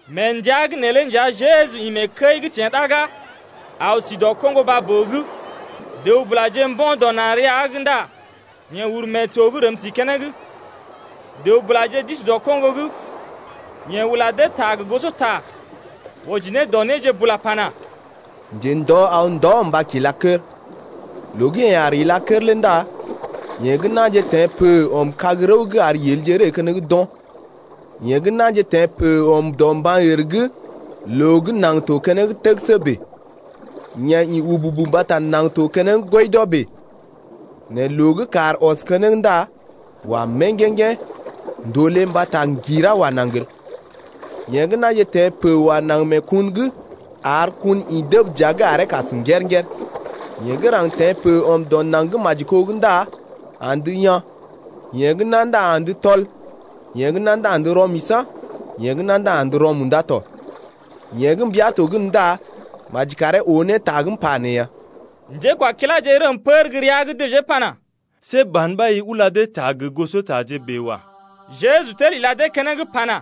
Mee ndəa’g neelé nja Jeju ḭ mee kəi’g teḛ ɗaga, aw si dɔ koŋgo baa-boo’g. Dəw-bulaje mbo̰ dɔ na̰ rəa’g ndá yeḛ uru mee to’g rəm si keneŋ. Dəw-bulaje d’isi dɔ koŋgo’g tɔ. Yeḛ ula dee ta gə gosota wɔji ne dɔ néje bula pana: Njendɔ aw ndɔ mba kila kər. Loo gə́ yeḛ aar ila kər lé ndá yee gə́ na̰je teḛ pə ɔm kag-rəw’g ar yelje ree keneŋ d’o̰. Yee gə́ na̰je teḛ pə ɔm dɔ mban-ər’g, loo gə́ naŋg to keneŋ təgəsə bèe. Yee ḭ wububu mbata naŋg to keneŋ ŋgwɔidɔ bèe, nɛ loo gə́ kàr ɔs keneŋ ndá wa mèŋgèŋgḛ̀, ndòlé mbata ŋgirá wa naŋg el. Yee gə́ na̰je teḛ pə wa naŋg mee kun’g, ar kun ḭ dəb dəa’g aree kas ker-ker. Yee gə́ raŋg teḛ pə ɔm dɔ naŋg gə́ maji kó’g ndá andə yaa̰, yee gə́ ná ndá andə tɔl, yee gə́ ná ndá andə rɔ-misa̰, yee gə́ ná ndá andə rɔ-munda tɔ. Yeḛ gə́ mbia to gən ndá maji karee oo ne ta gə́ m’pa nee ya. Njékwakiláje rəm pər gə́ rəa’g dəjee pana: See ban ɓa i ula dee ta gə gosotaje bèe wa. Jeju tel ila dee keneŋ pana: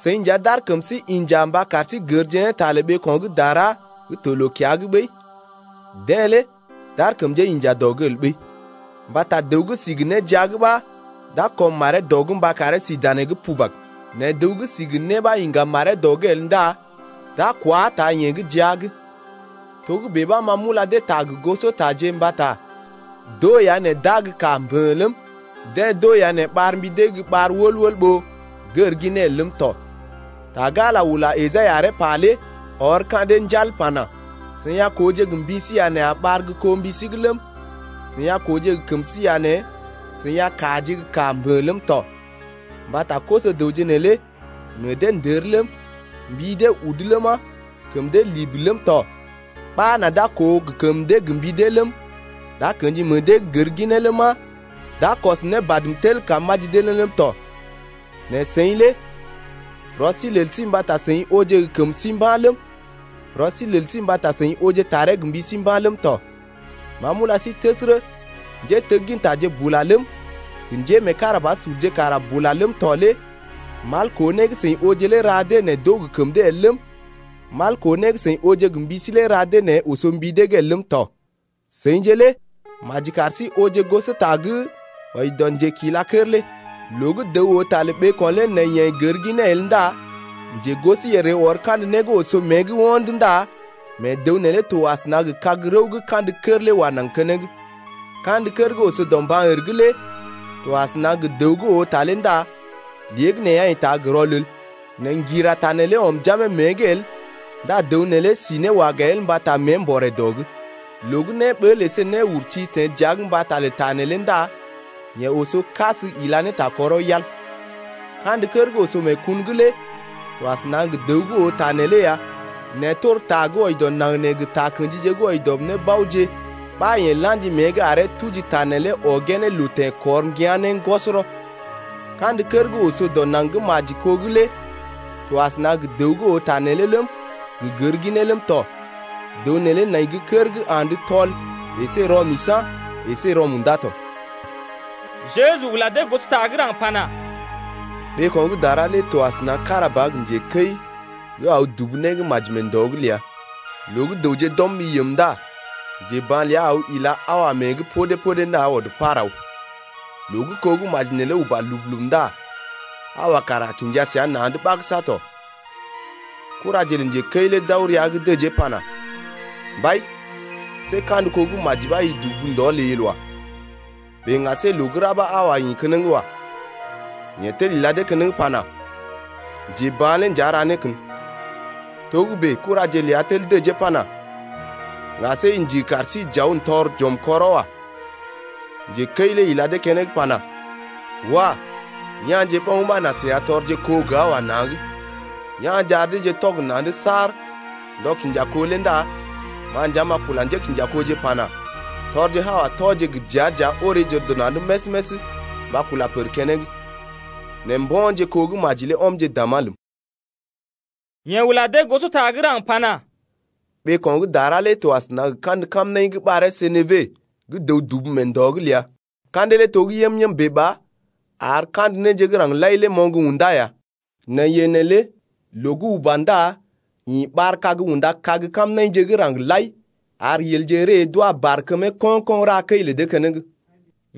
Seḭ nja, d’ar kəm sí inja mba kar sí gərje ne ta lə ɓeeko̰ gə́ dara gə́ to loo-kiya’g ɓəi, deḛ lé d’ar kəm dee inja dɔ’g el ɓəi. Mbata dəw gə́ si gə né jia’g ɓa d’a kɔm maree dɔ’g mba karee si danee’g pubag. Nɛ dəw gə́ si gə né ɓa iŋga maree dɔ’g el ndá d’a kwá taa yee gə́ jia’g lé. Togə́bè ɓa ma m’ula dee ta gə gosotaje mbata d’oo ya nɛ d’aa gə́ kaa mbə̰ ləm, deḛ d’oo ya nɛ ɓar mbi dee’g gə́ ɓar koo ɓó gər ginee el ləm tɔ. Ta gə́ Ala ula Esai aree pa lé ɔr gin ka̰ dee njal pana: Seḭ a kooje gə mbi sí ya nɛ a ɓar gə́ koo mbi sí’g ləm, Seḭ a kooje gə kəm sí ya nɛ seḭ a kaaje gə́ kaa mbə̰ ləm tɔ. Mbata koso-dəwje neelé meḛ dee ndər ləm, Mbi dee udu ləma, Kəm dee libi ləm tɔ Ɓa nà d’a koo gə kəm dee gə mbi dee ləm, D’a kḛji meḛ dee gər ginee ləma, D’a kɔs ne badm tel kam m’aji dee ne ləm tɔ. Nɛ seḭ lé rɔ sí lel sí mbata seḭ ooje gə kəm sí mba̰ ləm, rɔ sí lel sí mbata seḭ ooje taree gə mbi sí mba̰ ləm tɔ. Ma m’ula sí təsərə, njéteggintaje bula ləm, gə njémeekarabasurje kara bula ləm tɔ lé mal koo né gə́ seḭ ooje lé ra dee nɛ d’oo gə kəm dee el ləm, mal koo né gə́ seḭ ooje gə mbi sí lé ra dee nɛ oso mbi dee’g el ləm tɔ. Seḭje lé maji kar sí ooje gosota gə́ wɔji dɔ njekila kər lé. Loo gə́ dəw oo ta lə ɓeeko̰ lé nɛ yeḛ gər ginee el ndá njegosoyèr ree ɔr kandə né gə́ oso mée’g ho̰d ndá mee dəw neelé to asəna gə kag-rəw gə́ kandə kər lé wa naŋg keneŋ. Kandə kər gə́ oso dɔ mban-ər’g lé to asəna gə dəw gə́ oo ta lé ndá léegəneeya yeḛ taa gə́ rɔlel, nɛ ŋgira ta neelé ɔm jamee mée’g el ndá dəw neelé si ne waga el mbata mée mbɔré dɔ’g. Loo gə́ néɓəl əsé néurti teḛ dəa’g mbata lə ta neelé ndá yeḛ oso kas ila ne ta kɔrɔ yal. Kandə kər gə́ oso mee kun’g lé to asəna gə dəw gə́ oo ta neelé ya nɛ tor ta gə́ wɔji dɔ naŋg nee gə takə̰ji gə́ wɔji dɔ nébaoje ɓa yeḛ la̰ji mée’g aree tuji ta neelé ɔgee ne loo teḛkɔr ŋgia̰ ne ŋgɔsɔrɔ. Kandə kər gə́ oso dɔ naŋg gə́ maji kó’g lé to asəna gə dəw gə́ oo ta neelé ləm, gə gər ginee ləm tɔ. Dəw neelé nai gə́ kər gə́ andə tɔl əsé rɔ-misa̰ əsé rɔ-munda tɔ. Jeju ula dee gosota gə́ raŋg pana: Ɓeeko̰ gə́ dara lé to asəna kára ba gə njekəi gə́ aw dubu né gə́ maji mee ndɔ’g ləa. Loo gə́ dəwje d’ɔm ɓi yəm ndá njeba̰ ləa aw ila haowa mée’g podé-podé ndá ɔd par aw. Loo gə́ kó gə́ maji neelé uba lub-lub ndá haowa kara kinja səa na̰’d ɓagəsa tɔ. Kuraje lə njekəi lé d’aw rəa’g dəjee pana: Mbai, see kandə kó gə́ maji ɓa i dubu ndɔ ləi el wa. Bèe ŋga see loo gə́ ra ɓa haowa ḭ keneŋ wa. Yeḛ tel ila dee keneŋ pana: Njeba̰ lé nja ra né kən. Kuraje ləa lé tel dəjee pana: Ŋga see i ndigi kar sí j’aw n’tɔr j’ɔmje kɔrɔ wa. Njekəi lé ila dee keneŋ pana: Wah, ya̰je ɓoŋ ɓa nà seḭ a tɔrje kó gə haowa na̰’d. Ya̰je ar deeje tɔg na̰’d saar ndɔ kinja kó lé ndá ma nja m’a kula njékinjakoje pana: Tɔrje haowa tɔje gə dəa-dəa oreeje dɔ na̰’d més-més mba kula pər keneŋ, nɛ mbo̰je kó gə́ maji ɔmje dàmá ləm ya. Yeḛ ula dee gosota gə́ raŋg pana: Ɓeeko̰ gə́ dara lé to asəna gə kandə kamnaḭ gə́ ɓaree senebe gə́ dəw dubu mee ndɔ’g ləa. Ka̰dee lé to gə́ yəm-yəm bèe ba ar kandə néje gə́ raŋg lai lé moŋg undá ya. Nɛ yee neelé loo gə́ uba ndá ḭ ɓar-kag unda kag kamnaḭje gə́ raŋg lai ar yelje ree d’wa barkəmee ko̰-ko̰ ra kəi lə dee keneŋ.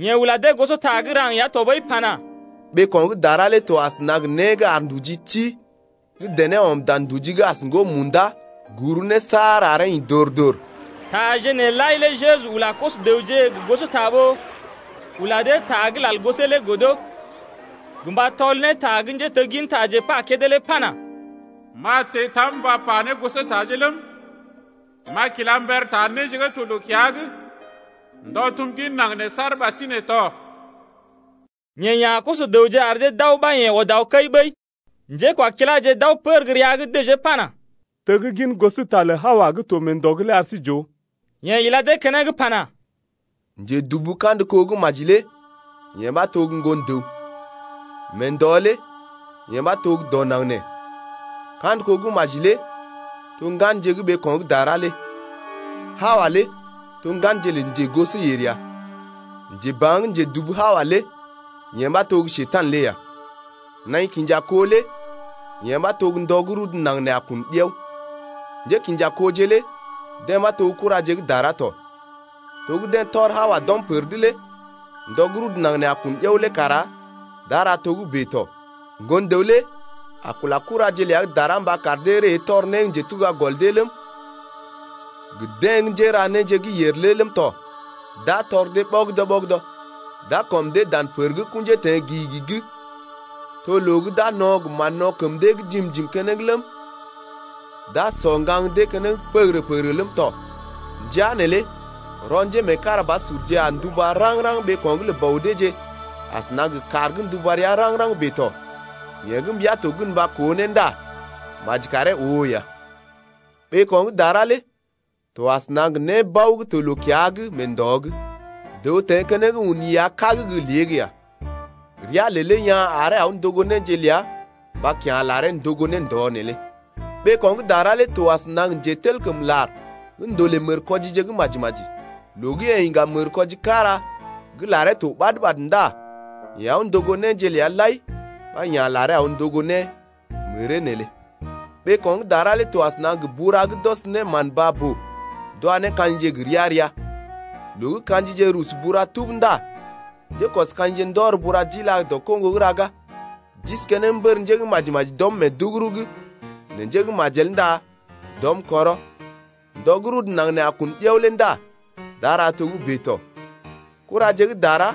Yeḛ ula dee gosota gə́ raŋg ya tɔɓəi pana: Ɓeeko̰ gə́ dara lé to asəna gə né gə́ ar nduji ti gə́ dené ɔm dan nduji as ŋgo munda’g guru ne saar aree ḭ dor-dor. Taje nee lai lé Jeju ula koso-dəwje gə gosota ɓó ula dee ta gə́ lal gosee lé godo, gə mba tɔl ne ta gə́ njéteggintaje pa kédé lé pana: M’a teḛ tam mba pa ne gosotaje ləm, M’a kila mber ta néje gə́ to loo-kiya’g Ndɔ tum gin naŋg nee saar ɓasinè tɔ. Yeḛ ya̰ koso-dəwje ar dee d’aw ɓa yeḛ ɔd aw kəi ɓəi. Njékwakiláje d’aw pər gə́ rəa’g dəjee pana: Teggin gosota lə haowa gə́ to mee ndɔ’g lé ar sí j’ooje. Yeḛ ila dee keneŋ pana: Njedubu kandə kó gə́ maji lé yee ɓa to gə́ Ŋgon-dəw. Mee ndɔ lé yee ɓa to gə́ dɔ naŋg nee. Kandə kó gə́ maji lé to ŋganje gə́ ɓeeko̰ gə́ dara lé. Haowa lé to ŋganje lə njegosoyèr ya. Njeba̰ gə́ njedubu haowa lé yee ɓa to gə́ Njekurai lé ya. Naḭ kinja kó lé yee ɓa to ndɔ gə́ rudu naŋg nee a kun ɗiao. Njékḭjakoje lé deḛ ɓa to kuraje gə́ dara tɔ. To gə́ deḛ tɔr haowa d’ɔm pər’d lé ndɔ gə́ rudu naŋg nee a kun ɗiao lé kara d’a ra togə́bè tɔ. Ŋgon-dəw lé a kula kuraje ləa gə́ dara mba kar dee ree tɔr né gə́ njetuga gɔl dee ləm, gə deḛ gə́ njéra néje gə́ yèr lé ləm tɔ, d’a tɔr dee ɓɔgədɔ-ɓɔgədɔ. D’a kɔm dee dan pər gə́ kṵjee teḛ gi-gi’g, to loo gə́ d’a no̰ kar mán kəm dee wa dee jiim-jiim keneŋ ləm, d’a sɔ ŋgaŋ dee keneŋ pəgərə-pəgərə ləm tɔ. Ndəa neelé rɔ njémeekarabasurje a nduba raŋg-raŋg ɓeeko̰’g lə Bɔ deeje asəna gə kàr gə́ nduba rəa raŋg-raŋg bèe tɔ. Yeḛ gə́ mbia to gən mba koo ne ndá maji karee oo ne ya. Ɓeeko̰ gə́ dara lé to asəna gə nébao gə́ to loo-kiya’g mee ndɔ’g. Dəw teḛ keneŋ un iya kág gə́ lée’g ya. Rea lelee yaa̰ aree aw ndogo néje ləa mba kya̰ laree ndogo ne ndɔ neelé. Ɓeeko̰ gə́ dara lé to asəna gə njetelkəmlar gə́ ndolè mərkwɔjije gə́ maji-maji. Loo gə́ yeḛ iŋga mərkwɔji kára gə́ laree to ɓad-ɓad ndá yeḛ aw ndogo néje ləa lai ɓa ya̰ laree aw ndogo ne məree neelé. Ɓeeko̰ gə́ dara lé to asəna gə bura gə́ d’ɔs ne mán baa-boo d’wa ne ka̰jije gə́ gə ria-ria. Loo gə́ ka̰jije rusu bura lé tub ndá njékɔs-ka̰jije lé ndɔr bura lé d’ila dɔ koŋgo’g raga. D’isi keneŋ mbər njé gə́ maji-maji d’ɔm mee duguru’g nɛ njé gə́ majel ndá d’ɔm kɔrɔ. Ndɔ gə́ rudu naŋg nee a kun ɗiao lé ndá d’a ra togə́bè tɔ. Kuraje gə́ dara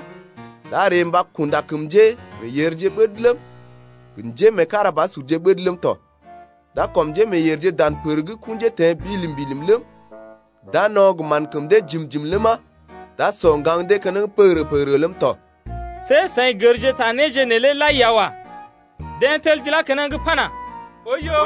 d’a ree mba kunda kəm njémeeyèrje ɓəd ləm, gə njémeekarabasurje ɓəd ləm tɔ. D’a kɔm njémeeyèrje dan pər gə́ kṵjee teḛ bilim-bilim ləm, d’a no̰ kar mán kəm dee wa dee jiim-jiim ləma, d’a sɔ ŋgaŋ dee keneŋ pəgərə-pəgərə ləm tɔ. See seḭ gərje ta néje neelé lai ya wa. Deḛ tel d’ilá keneŋ pana: Oiyo!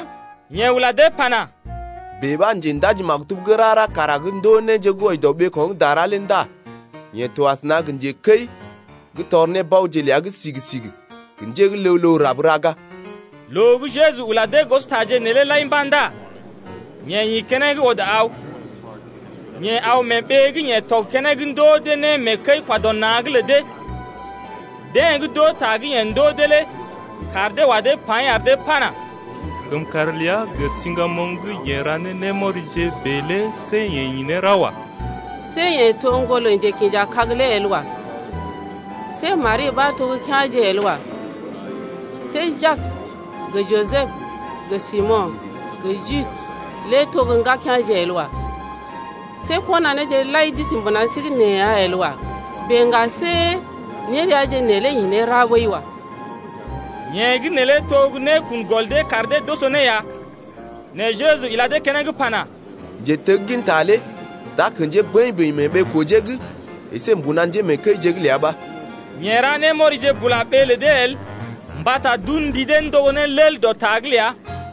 Yeḛ ula dee pana: Bèe ɓa njendaji-maktub gə́ rara kara gə́ ndoo néje gə́ wɔji dɔ ɓeeko̰ gə́ dara lé ndá yeḛ to asəna gə njekəi gə́ tɔr nébaoje ləa gə́ sigi-sigi gə njé gə́ ləw-ləw rab raga. Loo gə́ Jeju ula dee gosotaje neelé lai mba̰ ndá yeḛ ḭ keneŋ ɔd aw. Yeḛ aw mee ɓee gə́ yeḛ tɔg keneŋ ndoo dee né mee kəi-kwa-dɔ-na̰’g lə dee. Deḛ gə́ d’oo ta gə́ yeḛ ndoo dee lé kaar dee wa dee paḭ ar dee pana: Kəmkàr ləa gə siŋgamoŋ gə́ yeḛ ra ne némɔrije bèe lé see yeḛ ḭ ne ra wa. See yeḛ to ŋgolə njekḭjakag lé el wa. See Mari ɓa to gə́ kea̰je el wa. See Jak gə Jisəb gə Simo̰ gə Jude lé to gə́ ŋgakea̰je el wa. See kɔnaneeje lai d’isi mbuna sí’g nee ya el wa. Bèe ŋga see néreaje neelé yeḛ ḭ ne ra ɓəi wa. Yee gə́ neelé to gə́ né kun gɔl dee kar dee d’oso ne ya. Nɛ Jeju ila dee keneŋ pana: Njetegginta lé d’a kḛjee bəḭ-bəḭ mee ɓee-kojee’g əsé mbuna njémeekəije’g ləa ɓa. Yeḛ ra némɔrije bula ɓee lə dee el mbata d’un mbi dee ndogo ne lel dɔ ta’g ləa.